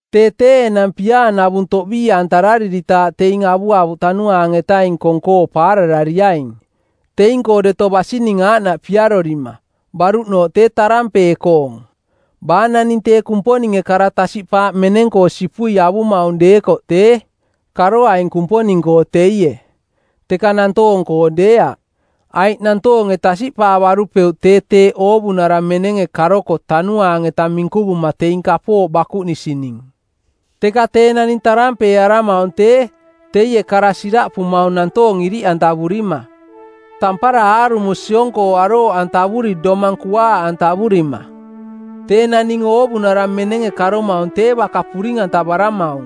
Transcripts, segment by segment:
Tee tee enang piaanavung toꞌbii-antarariritaaꞌ teing avuavuꞌ Tanuaang-etaning kong-koo paararariaing, teing-koo deto basining aaꞌnaꞌ piarorima, baruꞌnooꞌ tee tarampee-koong. Baa naning tee Kumponinge kara tasiꞌpaaꞌ meneng-koo sipui avumaung deekoꞌ tee, karoaing Kumponing-koo teie, teka nantoong-koo deeaꞌ, aiꞌ nantoonge tasiꞌpaavarupeuꞌ tee teeꞌ oovunara menenge karoko tanuaang-eta minkuvuma teing kapooꞌ bakuꞌnisining. Teka tee naning tarampeearamaung tee, teie kara siraꞌpumaung nantoong iriꞌantavurima, tampara aarumo siong-koo arooꞌantavuri domang kuaaꞌantavurima. Tee naning oovunara menenge karomaung tee baka puring-antavaramaung,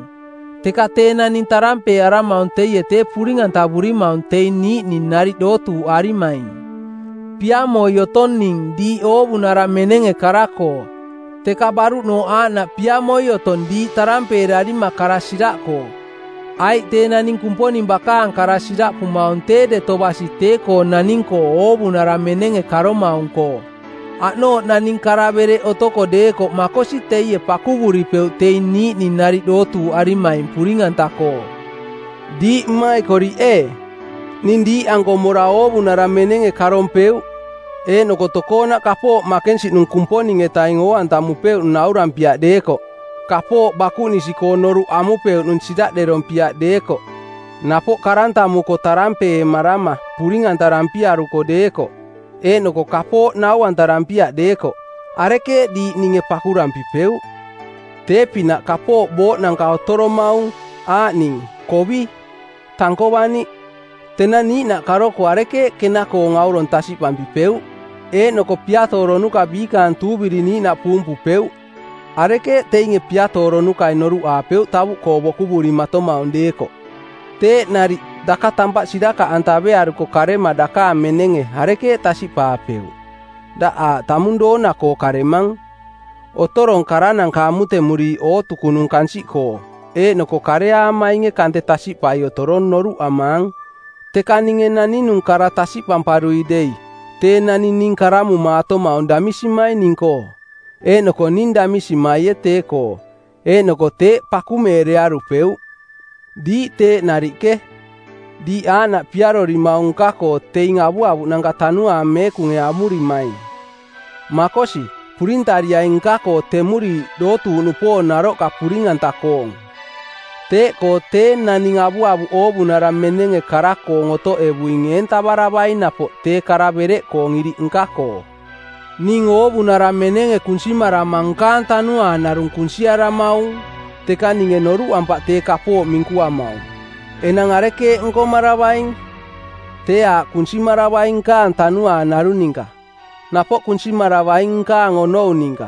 teka tee naning tarampeearamaung teie tee puring-antavurimaung teing niiꞌning nariꞌ dootuuꞌarimaing. Piamoi otong ning diiꞌ oovunara menenge kara-koo, teka baruꞌnooꞌ aaꞌnaꞌ piamoi otong diiꞌ tarampeerarima kara siraꞌkoo, aiꞌ tee naning Kumponing bakaang kara siraꞌpumaung tee deto basi tee-koo naning-koo oovunara menenge karomaung-koo. Aꞌnooꞌ naning kara-bereꞌ otoko deekoꞌ makosi teie pakuvuripeuꞌ teing niiꞌning nariꞌ dootuuꞌarimaing puring-anta-koo. Diiꞌ mmaikoriꞌ ee, ning diiꞌanko mora oovunara menenge karompeuꞌ eeꞌnoko tokoonaꞌ kapooꞌ makensiꞌnung Kumponing-etaing oo-antamupeuꞌning naurampiaꞌ deekoꞌ, kapooꞌ bakuꞌnisi-koong noruꞌ amupeuꞌnung siraꞌderompiaꞌ deekoꞌ, napoꞌ karantamuko tarampeemarama puring-antarampiaruko deekoꞌ, eeꞌnoko kapooꞌkoo nau-antarampiaꞌ deekoꞌ, arekeeꞌ diiꞌ ninge pakurampipeuꞌ? Tee-pinaꞌ kapooꞌ booꞌnanka otoromaung, aaꞌning kovi, tankovaniꞌ. Tenang niiꞌnaꞌ karoko arekeeꞌ kena-koong aurong tasiꞌpampipeuꞌ? Eeꞌnoko piatooronuka˜ biikaang tuuviri niiꞌnaꞌ puumpupeuꞌ, arekeeꞌ teinge piatooronukai noruꞌaapeuꞌ tavuꞌkoo bokuvurimatomaung deekoꞌ? Teeꞌ nariꞌ daka tampaꞌ sirakaꞌantavearuko karema dakaang menenge arekeeꞌ tasiꞌpaapeuꞌ? Daꞌ aaꞌ tamung doona-koo karemang. Otorong karananka amutemuriiꞌ ootukunung kansiꞌkoo, eeꞌnoko kareaamainge kante tasiꞌpai otorong noruꞌamaang. Teka ninge naninung kara tasiꞌpamparui dei tee naning ning karamumaatomaung damisimai ning-koo, eeꞌnoko ning damisimaie tee-koo, eeꞌnoko teeꞌ pakumeerearupeuꞌ. Diiꞌ teeꞌ nariꞌke. Diiꞌ aaꞌnaꞌ piarorimaung nka-koo teing avuavuꞌnanka Tanuaang Meekunge amurimaing. Makosi, purintariaing nka-koo temuriiꞌ dootuuꞌnupoong naroꞌka puring-anta-koong. Teeꞌkoo tee naning avuavuꞌ oovunara menenge kara-koong otoꞌevuing eentavaravaing napoꞌ tee kara bereꞌkoong iriꞌ nka-koo. Ning oovunara menenge kunsimarama nkaang tanuaang narung kunsiaramaung, teka ninge noruꞌampaꞌ tee kapooꞌ minkuamaung. Enang arekeeꞌ nkomaravaing? Tee aaꞌ kunsimaravaing nkaang tanuaang narung ninka, napoꞌ kunsimaravaing nkaang onou ninka.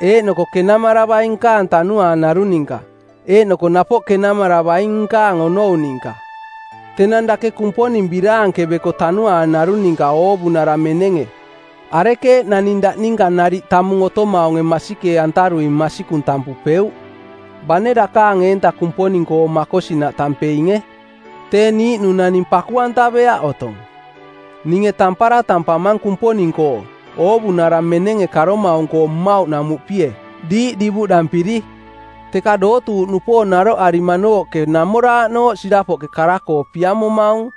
Eeꞌnoko kenamaravaing nkaang tanuaang narung ninka, eeꞌnoko napoꞌ kenamaravaing nkaang onou ninka. Tenang dake Kumponing biraankeveko tanuaang narung ninka oovunara menenge, arekeeꞌ naning daꞌ ninka nariꞌ tamung otomaunge masikee-antarui “Masikung” tampupeuꞌ? Bane dakaang eenta Kumponing-koo makosinaꞌ tampeinge, tee niiꞌnung naning paku-antaveaꞌ otong. Ninge tampara tampamang Kumponing-koo, oovunara menenge karomaung-koo mmauꞌnamuꞌpie, diiꞌ divuꞌdampiri. Teka dootuuꞌnupoong naroꞌarimanooꞌke namooraꞌnooꞌ sirapoꞌke kara-koo piamomaung,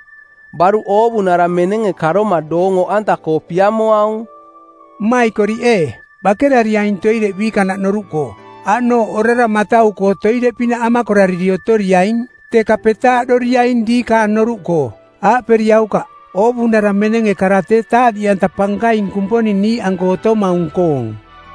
baruꞌ oovunara menenge karoma doong oꞌanta-koo piamoaung. Mmaikoriꞌ ee, bakerariaing toireꞌ biikanaꞌ noruꞌkoo. Aꞌnooꞌ, orara matau-koo toireꞌpinaꞌ amakorariri otoriaing, teka petaaꞌdoriaing diikaang noruꞌkoo. Aaꞌperiaukaꞌ, “Oovunara menenge kara tee taaꞌniꞌanta pankaing Kumponing niiꞌanko otomaung-koong.”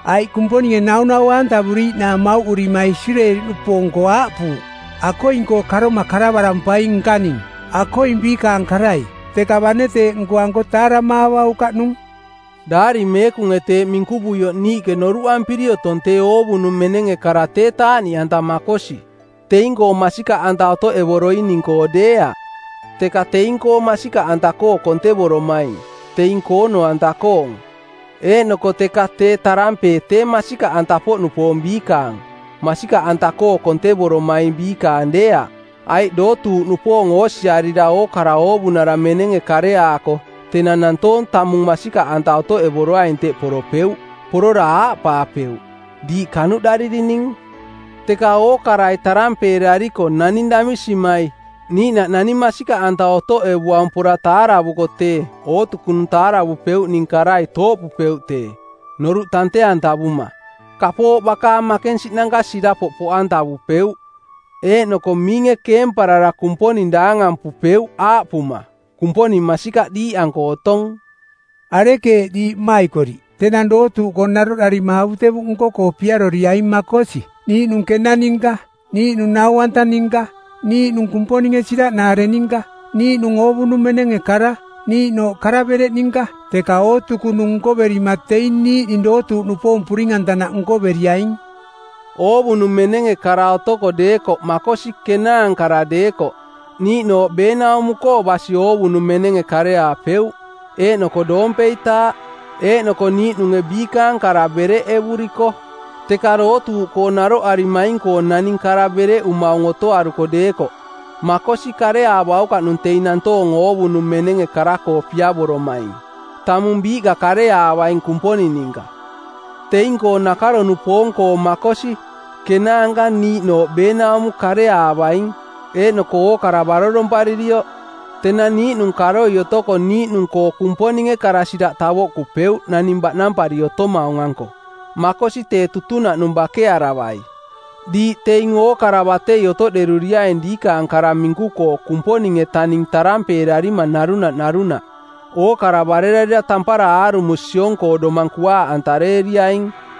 Aiꞌ Kumponinge naunaua-antavuriiꞌnaang mauꞌurima Isireeli-nupoong-koo aaꞌpuuꞌ, “Akoing-koo karoma karavarampaing nkaning, akoing biikaang karai. Teka bane teeꞌ nkoanko taaramaavaukaꞌnung.” Daari Meekunge teeꞌ minkuvuioꞌ niiꞌke noruꞌampiri otong tee oovunung menenge kara tee taaꞌniꞌanta makosi, teing-koo masikaꞌanta otoꞌevoroining-koo deeaꞌ, teka teing-koo masikaꞌanta-koo kontevoromaing, teing koono-anta-koong. Eeꞌnoko teka tee tarampee tee masikaꞌanta-poꞌnupoong biikaang, masikaꞌanta-koo kontevoromaing biikaang deeaꞌ. Aiꞌ dootuuꞌnupoong oosiarira ookara oovunara menenge kareaako tenang nantoong tamung masikaꞌanta otoꞌevoroaing teꞌ poropeuꞌ, porora aaꞌpaapeuꞌ, “Diiꞌ kanuꞌdaririning!” Teka ookarai tarampeerariko naning damisimai, niiꞌnaꞌ naning masikaꞌanta otoꞌevuaung pora taaravuko tee ootukunung taaravupeuꞌning karai tooꞌpupeuꞌ tee, noruꞌ tante-antavuma. Kapooꞌ bakaang makensiꞌnanka sirapoꞌ poꞌantavupeuꞌ eeꞌnoko miinge keemparara Kumponing daangampupeuꞌ aaꞌpuma, “Kumponing masikaꞌ diiꞌanko otong!” Arekeeꞌ, diiꞌ mmaikoriꞌ? Tenang dootuuꞌkoo naroꞌdarima avutevuꞌ nko-koo piaroriaing makosi, niiꞌnung kena ninka, niiꞌnung nau-anta ninka, niiꞌnung Kumponinge siraꞌnaare ninka, niiꞌnung oovunung menenge kara, niiꞌnooꞌ kara-bereꞌ ninka, teka ootukunung nkoverima teing niiꞌning dootuuꞌnupoong puring-antanaꞌ nkoveriaing. Oovunung menenge kara otoko deekoꞌ makosi kenaankara deekoꞌ niiꞌnooꞌ beenaumo-koo basi oovunung menenge kareaapeuꞌ, eeꞌnoko doompeitaaꞌ, eeꞌnoko niiꞌnunge biikaang kara bereꞌevuriko. Teka dootuuꞌkoo naroꞌarimaing-koo naning kara bereꞌumaung otoaruko deekoꞌ, makosi kareaavaukaꞌnung teing nantoong oovunung menenge kara-koo piavoromaing. Tamung biiꞌka kareaavaing Kumponing ninka. Teing-koo nakaro-nupoong˜koo makosi, kenaanka niiꞌnooꞌ beenaumo kareaavaing, eeꞌnoko ookara baroromparirioꞌ. Tenang niiꞌnung karoi otoko niiꞌnung-koo Kumponinge kara-siraꞌ tavoꞌkupeuꞌ naning baꞌnampari otomaung-anko, makosi tee tutunaꞌnung bakearavai. Diiꞌ teing ookara batei otoꞌderuriaing diikaang kara minku-koo Kumponing-etaning tarampeerarima narunaꞌ narunaꞌ, ookara barerarira tampara aarumo siong-koo domang kuaaꞌantareeriaing.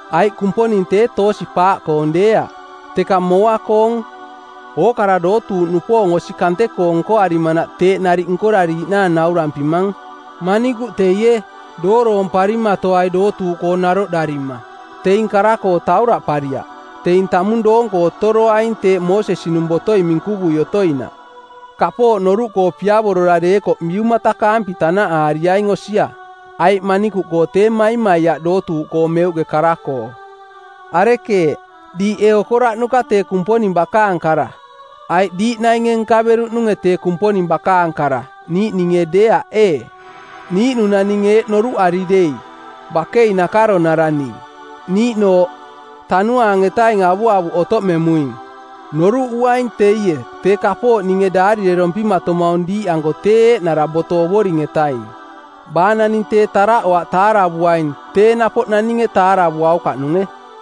Aiꞌ Kumponing tee toosi-paaꞌkoong deeaꞌ, teka mooa-koong. Ookara dootuuꞌnupoong osi kante-koo nkoarimanaꞌ teeꞌ nariꞌ nkorariiꞌnaang naurampimang. Manikuꞌ teie, dooroomparimatoai dootuuꞌkoo naroꞌdarima. Teing kara-koo tauraꞌpariaꞌ. Teing tamung doonko otoroaing teeꞌ Moosesi-nung botoi minkuvui otoinaꞌ. Kapooꞌ noruꞌkoo piavorora deekoꞌ biumatakaampi tanaꞌaariaing osia, aiꞌ manikuꞌkoo tee maimaiaꞌ dootuuꞌkoo meuꞌke kara-koo. Arekeeꞌ? Diiꞌ ee okoraꞌnuka tee Kumponing bakaang kara? Aiꞌ diiꞌ nainge nkaveruꞌnunge tee Kumponing bakaang kara, niiꞌninge deeaꞌ ee? Niiꞌnung naning eeꞌ noruꞌari dei, “Bakei nakaronara ning,” niiꞌnooꞌ, “Tanuaang-etaning avuavuꞌ otoꞌmemuing,” noruꞌuaing teie tee kapooꞌ ninge daarirerompimatomaung diiꞌanko tee eeꞌnara boto Ovoring-etaing. Baa naning tee taraꞌoaꞌ taaravuaing tee napoꞌ naninge taaravuaukaꞌnunge.